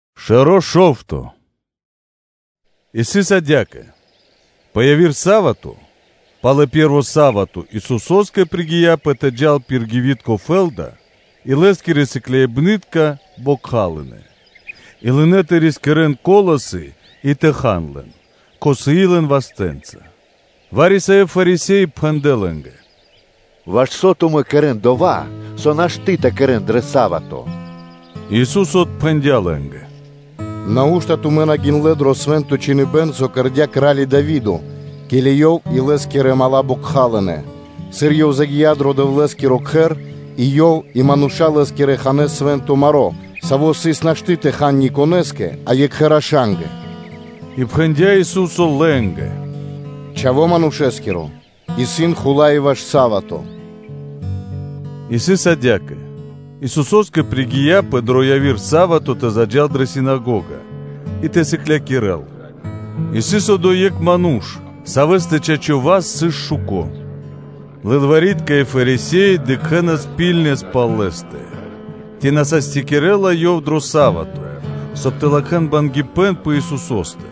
Пхучибэна́ пал Са́вато (Субо́та) И сыс адя́кэ: пэ яви́р дывэ́с дро пэ́рво са́вато, пэ яви́р Патрадякиро дывэ́с Исусо́скэ пригияпэ тэ джал пир гивитко фэ́лда, и Лэ́скирэ сыкляибны́тка бокхалынэ, и лынэ́ тэ рискирэнас колосы и хан лэн, кхосыи лэн вастэ́нца. Вари-савэ́ Фарисе́и пхэндлэ́ лэ́нгэ: “Ваш со тумэ́ кэрэ́на дова́, со нашты́ тэ кэрэ́н дро са́вато?” Ису́со отпхэндя́ лэ́нгэ: “Нау́што тумэ́ на гиндлэ́ дро Свэ́нто Чхиныбэ́н, со кэрдя́ кра́ли Дави́до, ке́ли ёв и лэ́скирэ мала́ бокхалынэ? сыр ёв загия́ дро Дэвлэ́скиро Кхэр, и ёв и мануша́ лэ́скирэ ханэ́ свэ́нто маро́, саво́ сыс нашты́ тэ хал никонэ́скэ, а екхэ рашангэ? И пхэндя́ Ису́со лэ́нгэ: “Чхаво́ Манушэ́скиро исын Хула́й и пэ са́вато.” И сыс адя́кэ: Исусо́скэ пригияпэ дро яви́р са́вато тэ заджа́л дрэ синагога и тэ сыклякирэ́л. И сыс одо́й екх ману́ш, савэ́стэ чачо́ (право) васт сыс шуко. Лылвари́тка и Фарисе́и дыкхэнас ракхибны́ткэс пал Лэ́стэ, ци на састякирэлас Ёв дро са́вато, соб (кай) тэ латхэ́н бангипэн пэ Исусо́стэ.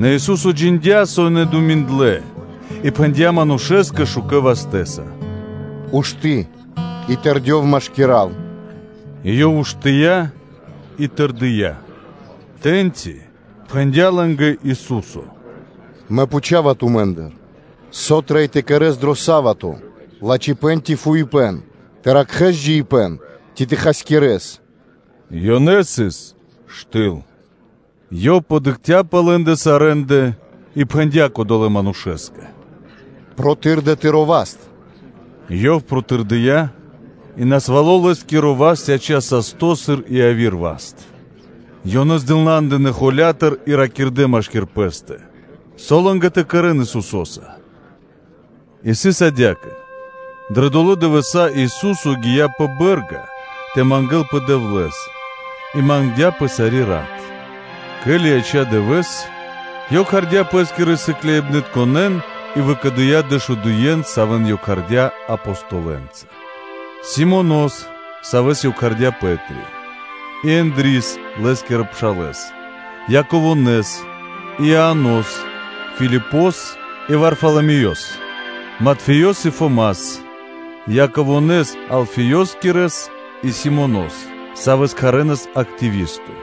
Нэ Ису́со джиндя́, со ёнэ думиндлэ, и пхэндя́ манушэ́скэ шукэ́ вастэ́са: “Ушты́ и тэрдёв машкира́л.” И ёв уштыя́ и тэрдия́. Тэ́ньци пхэндя́ лэ́нгэ Ису́со: “Мэ пхучава тумэ́ндыр: со трэй тэ кэрэ́с дро са́вато: лачхипэ́н ци фуипэ́н, тэ ракхэ́с джиибэ́н ци тэ хасякирэс?” Ёнэ сыс штыл. Ёв подыкхця́ пэ лэ́ндэ сарэ́ндэ, и пхэндя́ кодолэ́ манушэ́скэ: “Протырдэ тыро́ васт.” Ёв протырдыя́, и насвало́ лэ́скиро васт яця́ састо́, сыр и яви́р васт. Ёнэ нашадэ пэс тэды холя́тыр и ракирдэ́ машки́р пэ́стэ, со лэ́нгэ тэ кэрэ́н Исусо́са? И сыс адя́кэ: дрэ долэ́ дывэса́ Ису́со гия́ пэ бэ́рга тэ мангэ́лпэ Дэвлэ́скэ и мангдя́пэ сари́ рат. Ке́ли яця́ дывэ́с, Ёв кхардя́ Пэ́скирэ сыкляибнытконэ́н и выкэдыя́ дэшудуен, савэ́н Ёв кхардя́ Апостолэнца: Симонос, савэ́с Ёв кхардя́ “Пэ́три”, и Ендрис (Андреёс), лэ́скирэ пшалэ́с, Яковонэс и Ианос, Филипос и Варфаламеёс, Матфеёс и Фомас, Яково́с, Алфеёскирэс и Симонос, савэ́с кхарэнас Зилото (Активисто),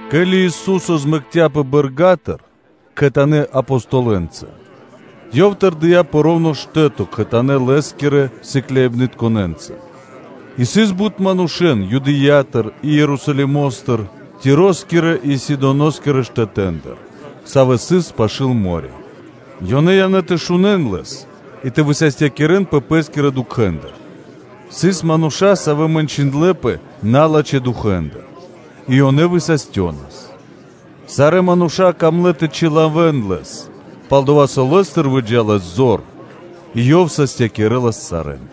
Ке́ли Ису́со змэкцяпэ бэрга́тыр кхэтанэ́ Апостолэнца, Ёв тэрдия́ пэ роўно (во́рто) штэ́то кхэтанэ́ Лэ́скирэ сыкляибнытконэ́нца; и сыс бут мануша́ Юдэя́тыр и Ерусалимо́стыр, Тироскирэ и Сидоноскирэ штэтэ́ндыр, савэ́ сыс пашы́л мо́рё (дэрья́в): ёнэ явнэ́ тэ шунэ́н Лэс и тэ высастякирэнпэ пэ́скирэ дукхэндыр; сыс манушэ, савэ́ мэнчындлэпэ налачхэ́ дукхэндыр, и ёнэ высастёнас. Сарэ́ мануша́ камлэ́ тэ чилавэн Лэс, пал-дова́ со Лэ́стыр выджа́лас зор и Ёв састякирэлас сарэ́н.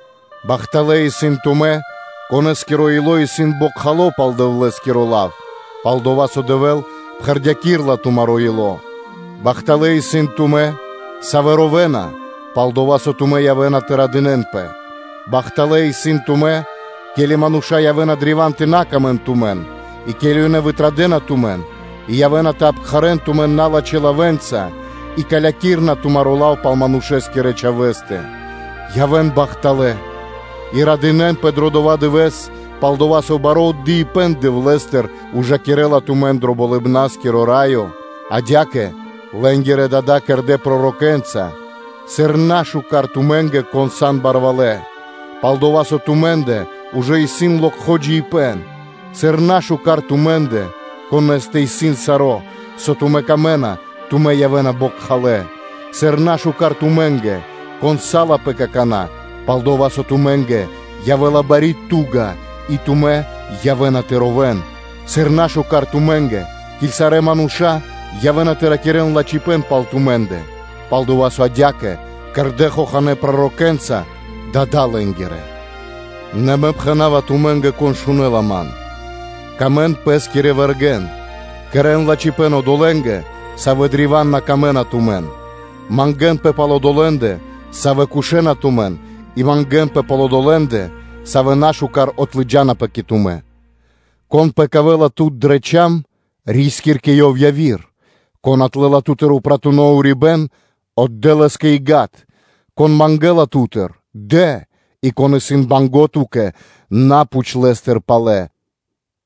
Бахталэ́ исын тумэ́, конэ́скиро ило́ исын бокхало пал Дэвлэ́скиро лав, пал-дова́ со Дэвэ́л пхэрдякирэла тумаро́ ило́. Бахталэ́ исын тумэ́, савэ́ ровэна, пал-дова́ со тумэ́ явэ́на тэ радынэ́нпэ. Бахталэ́ исын тумэ́, ке́ли мануша́ явэ́на древа́н тэ бидыкхэн тумэн и, ке́ли ёнэ вытрадэна тумэн и явэ́на тэ обкхарэн тумэн налачхэ́ лавэ́нца и калякирэна тумаро́ лав пал Манушэ́скирэ Чхавэ́стэ. Явэ́н бахталэ́ и радынэ́нпэ дро дова́ дывэ́с, пал-дова́ со бари мазу́ри (награда) Дэвлэ́стыр ужакирэ́ла тумэн дро Болыбна́скиро Раё. Адя́кэ лэ́нгирэ дада́ кэрдэ́ пророкэнца. Бида тумэ́нгэ, кон исын барвалэ́! Пал-дова́ со тумэ́ндэ ужэ исын локхо джиибэ́н! Бида тумэ́нгэ, конэ́стэ исын саро́, со тумэ́ камэ́на; тумэ́ явэ́на бокхалэ́. Бида тумэ́нгэ, кон салапэ какана́; пал-дова́ со тумэ́нгэ явэ́ла бари ту́га и тумэ́ явэ́на тэ ровэ́н. Бида тумэ́нгэ, ке́ли сарэ́ мануша́ явэ́на тэ ракирэ́н лачхипэ́н пал тумэ́ндэ. Пал-дова́ со адя́кэ кэрдэ́ хоханэ́ пророкэнца дада́ лэ́нгирэ. Нэ Мэ пхэна́ва тумэ́нгэ, кон шунэ́ла ман: сыка́в паты́в пэ́скирэ вэргэ́нгэ, кэрэ́н лачхипэ́н одолэ́нгэ, савэ́ кэрэ́на чорипэ́н тумэ́нгэ, мангэ́нпэ пал одолэ́ндэ, савэ́ кошэна тумэн и мангэ́нпэ пал одолэ́ндэ, савэ́ нашукар отлыджанапэ кэ тумэ́. Кон пэкавэла тут дрэ чам (шчока), ри́скир кэ ёв яви́р, кон отлэла ту́тыр упратуно урибэ́н, отдэ́ лэ́скэ и гад. Кон мангэ́ла ту́тыр, дэ, и кон исын банго́ ту́кэ, на пхуч лэ́стыр палэ.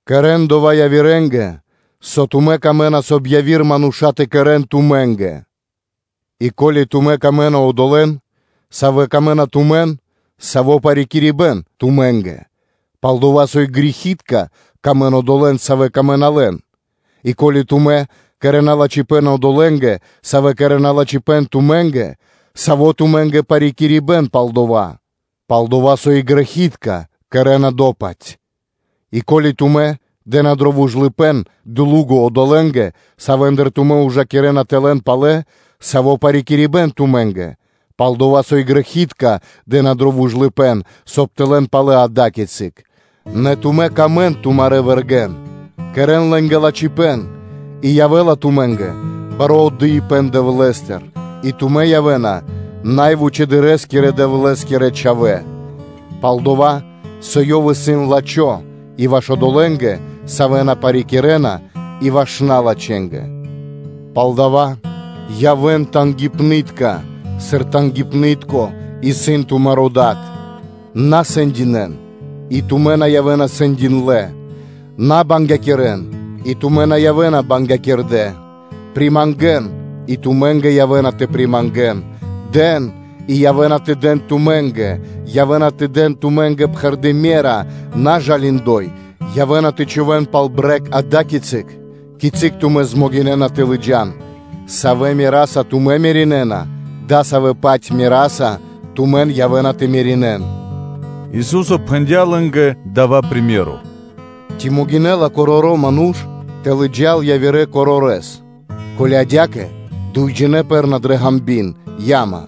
Кэрэ́н дова́ явирэ́нгэ, со тумэ́ камэ́на, соб (кай) яви́р мануша́ тэ кэрэ́н тумэ́нгэ. И ко́ли тумэ́ сыкавэ́на паты́в одолэ́нгэ, савэ́ сыкавэ́на паты́в тумэ́нгэ, саво́ парикирибэн тумэ́нгэ? Пал-дова́ со и грэхи́тка сыкавэ́на паты́в одолэ́нгэ, савэ́ сыкавэ́на паты́в лэ́нгэ. И ко́ли тумэ́ кэрэ́на лачхипэ́н одолэ́нгэ, савэ́ кэрэ́на лачхипэ́н тумэ́нгэ, саво́ тумэ́нгэ парикирибэн пал дова́? Пал-дова́ со и грэхи́тка кэрэ́на до-паць. И ко́ли тумэ́ дэ́на дро вужлыпэ́н (длуго) одолэ́нгэ, савэ́ндыр тумэ́ ужакирэ́на тэ лэн палэ, саво́ парикирибэн тумэ́нгэ? Пал-дова́ со и грэхи́тка дэ́на дро вужлыпэ́н, соб (кай) тэ лэн палэ адакицык. Нэ тумэ́ сыкавэ́н паты́в тумарэ́ вэргэ́нгэ, кэрэ́н лэ́нгэ лачхипэ́н и явэ́ла тумэ́нгэ бари мазу́ри (награда) Дэвлэ́стыр, и тумэ́ явэ́на Най Вучэдырэскирэ Дэвлэ́скирэ чхавэ́; пал-дова́ со Ёв исын лачхо́ и ваш одолэ́нгэ, савэ́ на парикирэна и ваш налачхэнгэ. Палдава́ явэ́н тангипны́тка (жалиныбнытка), сыр тангипны́тко исын тумаро́ Дад. На сэндинэ́н, и тумэ́ на явэ́на сэндиндлэ; на бангякирэн, и тумэ́ на явэ́на бангякирдэ; примангэн и тумэ́нгэ явэ́ла примангло. Дэн и явэ́на тэ дэн тумэ́нгэ: явэ́на тэ дэн тумэ́нгэ пхэрды́ ме́ра, и притасадо саро́ тэ явэ́л, би тангипнаскиро (жалимакиро), явэ́на тэ чхувэ́н тумэ́нгэ пал брэг ада́кицы, кицы́ тумэ́ змогинэна тэ лыджа́н; савэ́ мераса тумэ́ меринэна, дасавэ́-паць мераса тумэн явэ́на тэ меринэн.” Ису́со пхэндя́ лэ́нгэ дава́ приме́ро: “Ци могинэ́ла короро́ ману́ш тэ лыджа́л явирэ корорэс? Ко́ли адя́кэ, дуйджинэ́ пэрэ́на дрэ ґанби́н (яма)?”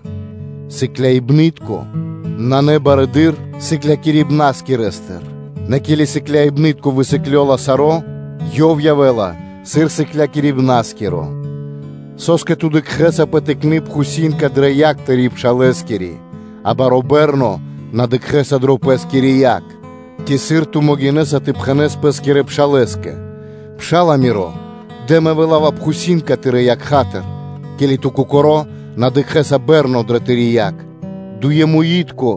Сыкляибны́тко исын на барэды́р сыклякирибнаскирэстыр; нэ ке́ли сыкляибны́тко высыклёла саро́, ёв явэ́ла сыр сыклякирибна́скиро. Со́скэ ту дыкхэ́са пэ тыкны пхусинка дрэ якх тырэ́ пшалэскири, а баро́ бэрно на дыкхэ́са дрэ пэ́скири якх? Ци сыр ту могинэ́са тэ пхэнэ́с пэ́скирэ пшалэ́скэ: ‘Пша́ла, миро! Дэ, мэ вылава пхусинка тырэ́ якхатыр,’ ке́ли ту кокоро́ на дыкхэ́са бэрно дрэ тыри́ якх? Дуемуи́тко,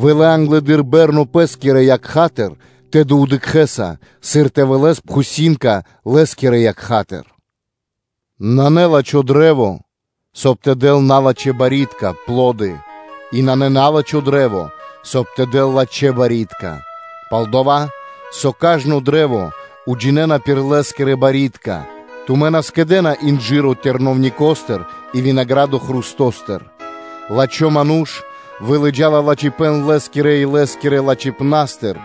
вылэ англэды́р бэрно пэ́скирэ якхатыр, тэды дыкхэ́са, сыр тэ вылэс пхусинка лэ́скирэ якхатыр. Кашт и Лэ́скирэ Барьякирдэ́ (Пло́ды) Нанэ лачхо́ кашт (дрэ́во), соб (кай) тэ дэл налачхэ́ барьякирдэ́ (пло́ды); и нанэ на́лачхо кашт, соб (кай) тэ дэл лачхэ́ барьякирдэ́. Пал-дова́ со кажно кашт уджинэна пир лэ́скирэ барьякирдэ́, тумэ́ на скэдэ́на инжыро хрустостыр сувьенца, и винаградо хрустостыр. Лачхо́ ману́ш вылыджала лачхипэ́н лэ́скирэ–илэ́скирэ кучипнастыр,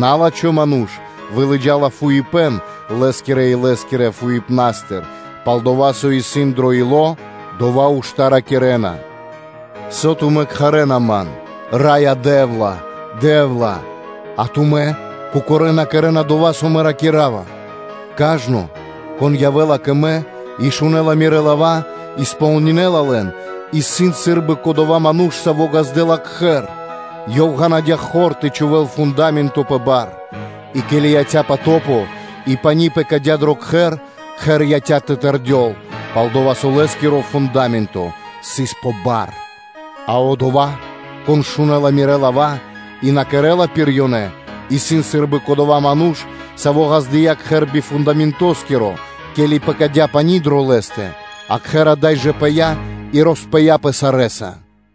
на́лачхо ману́ш вылыджала фуипэ́н лэ́скирэ-илэ́скирэ фуипнастыр; пал-дова́, со исын дро ило́, дова́ ушта́ ракирэ́на. Со тумэ́ кхарэ́н Ман, ‘Раё Дэ́вла! Раё Дэ́вла,’ а тумэ́ кокорэ́ на кэрэ́на дова́, со Мэ ракира́ва? Кажно, кон явэ́ла кэ Мэ и шунэ́ла Мирэ́ лава́, и кэрэ́ла кэ ко́нцо/яго́ро (сполнинэла) лэн, исын сы́рбы: кодова́ ману́ш, саво́ ґаздэ́ла кхэр; и ёв ґанадя хор тэ чхувэ́л фунда́менто пэ бар. И ке́ли яця́ потопо, и пани́ пэкадя́ дро до кхэр, кхэр яця́пэ тэ тэрдёл, пал-дова́ со лэ́скиро фунда́менто сыс пэ бар. А одова́, кон шунэ́ла Мирэ́ лава́ и на кэрэ́ла пир лэ́ндэ, исын сы́рбы кодова́ ману́ш, саво́ ґаздыя́ кхэр би фундаментоскиро; ке́ли пэкадя́ пани́ дро лэ́стэ, кхэр ада́й жэ пыя́, и роспыяпэ сарэ́са.”